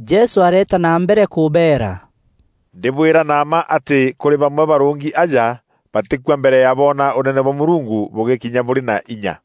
Jesû areeta na mbere kûbeera, “Ndîbwîra na mma atî kûrî bamwe barûngi aja batîkua mbere ya boona Ûnene bwa Mûrungu bûgîkinya bûrî na inya.”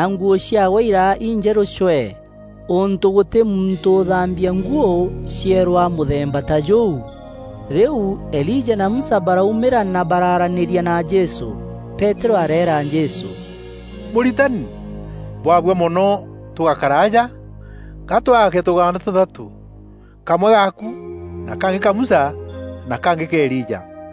nguû ciaawe iraa injerû cwee, ûntû gûtî muntû ûthambia nguû cierûa mûthemba ta jûu. Rîu Elija na Musa baraumîra na baraaranîria na Jesû. Peterû areera Jesû, “Mûritani, Bwabua mono tûgakara aja. Ga twaake tûgaanda tûthatû: kamwe gaaku, na kangî ka Musa na kangî ka Elija.”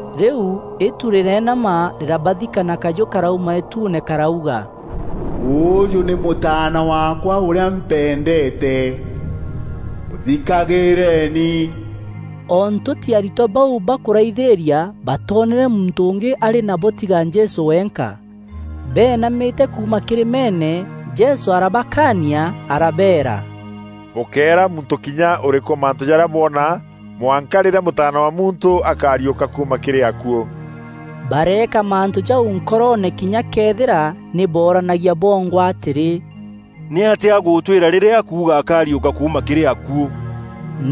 Rîu îtu rîreenama rîrabathika na kajû karauma îtuune karauga, “Ûûjû nî Mûtaana waakwa ûrîa mpendeete, mûthikagîîreni.” O ntûti aritwa bau bakûraithîîria batoonere muntû ûngî arî nabo tiga Jesû wenka. Beenamîte kuuma kîrîmeene, Jesû arabakaania arabeera, “Bûkéera muntû kinya ûrîkû mantû jarîa bwona mwanka rîrîa Mûtaana wa Muntû akariûka kuuma kîrî akuû.” Bareeka mantû jau nkoroone kinya këethîra nî booranagia bongwa atîrî, “Nîatîa agûtwîra rîrîa akuuga ‘Akariûka kuuma kîrî akuû?’”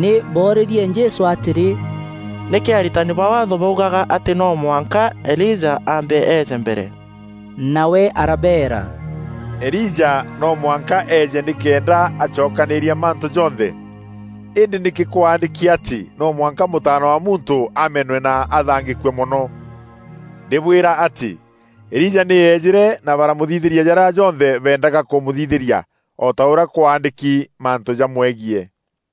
Nî boorîrie Jesû atîrî, “Nîkî aritani ba Waatho baugaga atî no mwanka Elija aambe eeje mbere?” Nawe arabeera, “Elija no mwanka eeje nîkenda acokanîîria mantû jonthe. Îndî nîkî kwaandîki atî no mwanka Mûtaana wa Muntû amenwe na athaangîkue mono? Ndîbwîra atî, Elija nî eejîre na baramûthithîria jarîa jonthe beendaga kûmûthithîria, o ta ûrîa kwaandîki mantû jamwegiî.”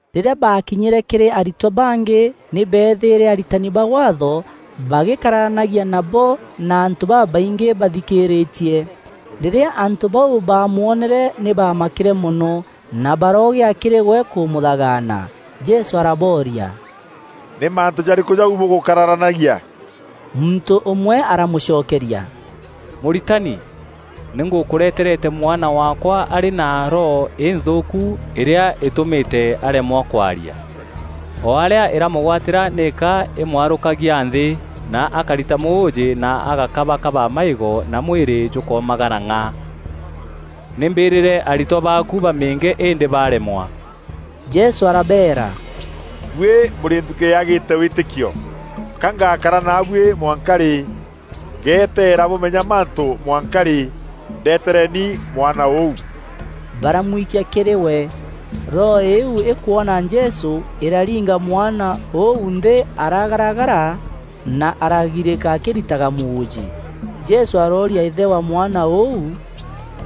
Rîrîa baakinyîre kîrî aritwa bangî nî beethîîre aritani ba Waatho bagîkararanagia nabo na antû babaingî bathikîrîtie. Rîrîa antû bau baamwonere nî baamakîre mono na baroogîa kîrî we kûmûthagaana. Jesû arabooria, “Nî mantû jarîkû jau bûgûkararanagia?” Muntû ûmwe aramûcokeria, “Mûritani, nî ngûkûreterete mwana waakwa arî na roho înthûûku îrîa îtûmîte aremwa kwaria. O arîa îramûgwatîra nîka îmwarûkagia nthî, na akarita mûûjî na agakabakaba maîgo na mwîrî jûkoomagara ng'a. Nî mbîrîre aritwa baaku bamîînge îndî baremwa.” Jesû arabeera, “Buî bûrî nthukî yaagîte wîtîkio! Ka ngakara naabuî mwanka rî? Ngeteera bûmenya mantû mwanka rî? Ndetereni mwana ûu.” Baramwikia kîrî we. Roho îîu îkwona Jesû, îraringa mwana ûu nthî aragaragara na aragirîka akîritaga mûûjî. Jesû arooria îthe wa mwana ûu,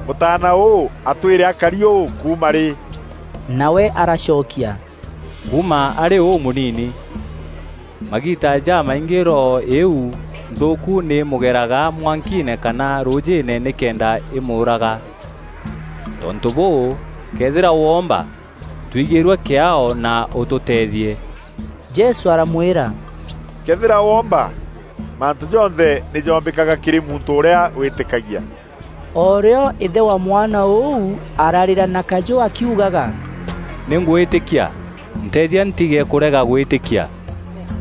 “Mûtaana ûû atwîre akari ûû kuuma rî?” Nawe aracokia, “Kuuma arî ûmûnini. Magiita jamaingî roho îîu nthûûku nî mûgeraga mwankiine kana rûûjîîne nîkenda îmûûraga. Tontû bûû, këethîra woomba, twigîîrue kîaao na ûtûteethie!” Jesû aramwîra, “Këethîra woomba! Mantû jonthe nî joombîkaga kîrî muntû ûrîa wîîtîkagia.” O rîo îthe wa mwana ûu ararîra na kajû akiugaga, “Nî ngwîtîkia, nteethia ntige kûrega gwîtîkia.”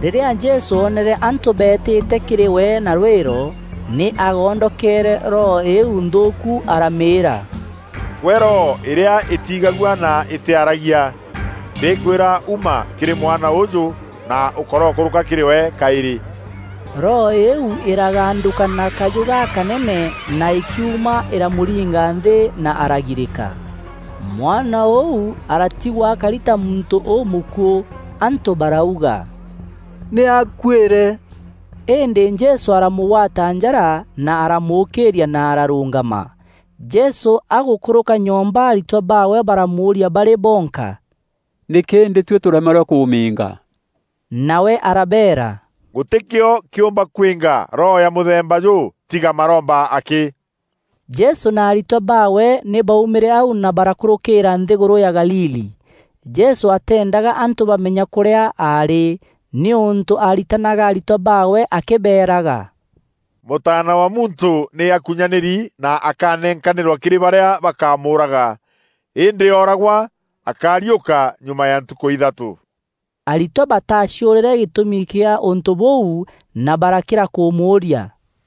Rîrîa Jesû oonere antû beetîte kîrî we na rwîro, nî aagondokeere roho îîu nthûûku aramîîra, “Gwe roho îrîa îtiigagua na îtîaragia, ndîkwîra uma kîrî mwana ûûjû na ûkorokûrûka kîrî we kaîrî!” Roho îîu îragandûka na kajû gakanene na îkiuma, îramûringa nthî na aragirîka. Mwana ûu aratigwa akari ta muntû ûmûkuû. Antû barauga “Nî akuîre.” Îndî Jesû aramûgwata njara na aramûkîîria na ararûngama. Jesû agûkûrûka nyomba, aritwa baawe baramûûria barî bonka, “Nîkî îndî tuî tûremerwe kûmîînga?” Nawe arabeera, “Gûtî kîo kîûmba kwînga roho ya mûthemba jûu tîga maromba akî.” Jesû na aritwa baawe nî baaumîre au na barakûrûkîîra nthîgûrû ya Galili. Jesû ateendaga antû bamenya kûrîa aarî nîûntû aaritanaga aritwa baawe akîbeeraga, “Mûtaana wa Muntû nî akunyanîri na akanenkaîrwa kîrî barîa bakamûûraga. Îndî ooragwa, akariûka nyuma ya ntukû ithatû.” Aritwa bataaciûrîre gîtûmi gîa ûntû bûu na barakîra kûmûûria.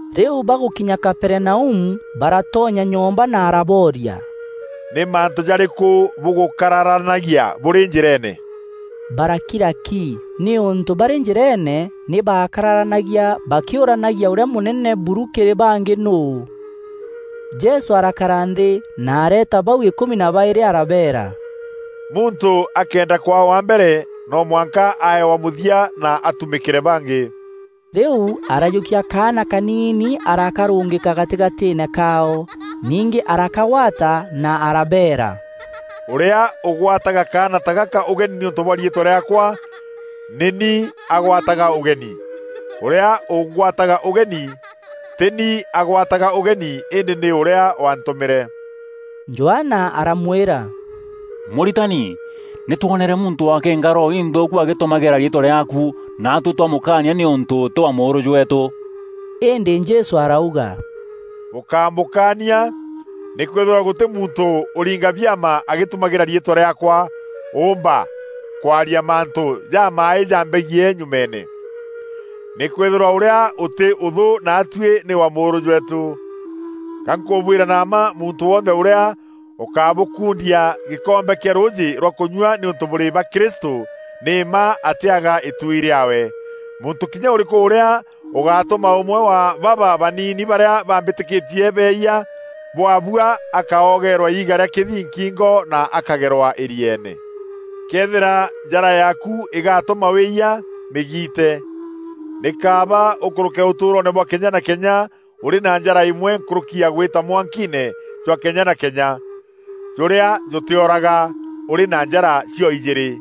Rîu bagûkinya Kaperinaumu baratonya nyomba na arabooria, “Nî mantû jarîkû bûgûkararanagia bûrî njîreene?” Barakira ki, nîûntû barî njîreene nî baakararanagia bakîûranagia ûrîa mûnene buru kîrî bangî nûû. Jesû arakara nthî, na areeta bau îkûmi na baîrî arabeera, “Muntû akëenda kwaa wa mbere, no mwanka ae wa mûthia na atumîkîre bangî.” Rîu arajûkia kaana kaniini arakarûngîka gatîgatîîne kaao. Ningî arakagwata na arabeera, “Ûrîa ûgwataga kaana ta gaka ûgeni nîûntû bwa riîtwa rîaakwa, nî ni agwataga ûgeni. Ûrîa ûngwataga ûgeni, tî ni agwataga ûgeni îndî nî ûrîa waantûmîre.” Johana aramwîra, “Mûritani, nî twonere muntû akîînga roho inthûûku agîtumagîra riîtwa rîaaku, naatuî twamûkaania nîûntû tî wa mûûrû jweetû.” Îndî Jesû arauga, “Bûkámûkaania, nîkwîthîrwa gûtî muntû ûringa biama agîtumagîra riîtwa rîaakwa, ûûmba kwaria mantû jamaaî jambegiî nyumeene. Nîkwîthîrwa ûrîa ûtî ûthû naatuî nî wa mûûrû jweetû. Ga nkûbwîra na mma muntû wonthe ûrîa ûkabûkundia gîkombe kîa rûûjî rwa kunyua nîûntû bûrî ba Kristû, nî mma atîaga îtuui rîaawe.” “Muntû kinya ûrîkû ûrîa ûgatuma ûmwe wa baba baniini barîa bambîtîkîtie beeyia, bwabua akoogeerwa iiga rîa kîthii nkingo na akagerwa îrieene. Këethîra njara yaaku îgaatûma wîyia, mîgiite! Nî kaaba ûkûrûke ûtûûroone bwa kenya na kenya ûrî na njara îmwe nkûrûki gwîta mwankiine jwa kenya na kenya, jûrîa jûtîoraga, ûrî na njara cio-ijîîrî. [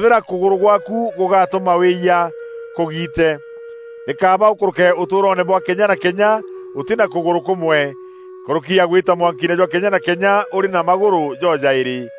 Këethîra kûgûrû gwaaku gûgatûma wîyia, Kûgiite! Nî kaaba ûkûrûke ûtûûroone bwa kenya na kenya ûtî na kûgûrû kûmwe, nkûrûki ya gwîta mwankiine jwa kenya na kenya ûrî na magûrû jo-jaîrî. [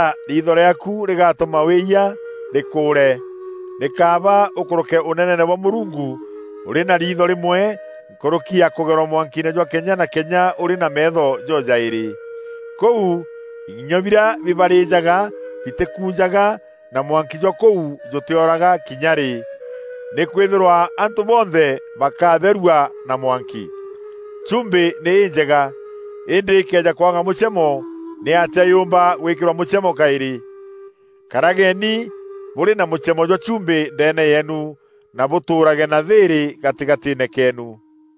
Këethîra riitho rîaaku rîgatûma wîyîa, rîkûûre! Nî kaaba ûkûrûke Ûneneene bwa Mûrungu ûrî na riitho rîmwe nkûrûki ya kûgerwa mwankiine jwa kenya na kenya ûrî na meetho jo-jaîrî. Kûu ing'inyo birîa bibarîjaga bitîkujaga na mwanki jwa kûu jûtîoraga kinya rî. Nîkwîthîrwa antû bonthe bakatherua na mwanki. Chumbî nî înjega, îndî îkëeja kwaga mûchemo, nîatîa yûûmba gwîkîrwa mûchemo kaîrî? Karageni bûrî na mûchemo jwa chumbî ndeene yeenu, na bûtûûrage na thîîrî gatîgatîîne keenu.”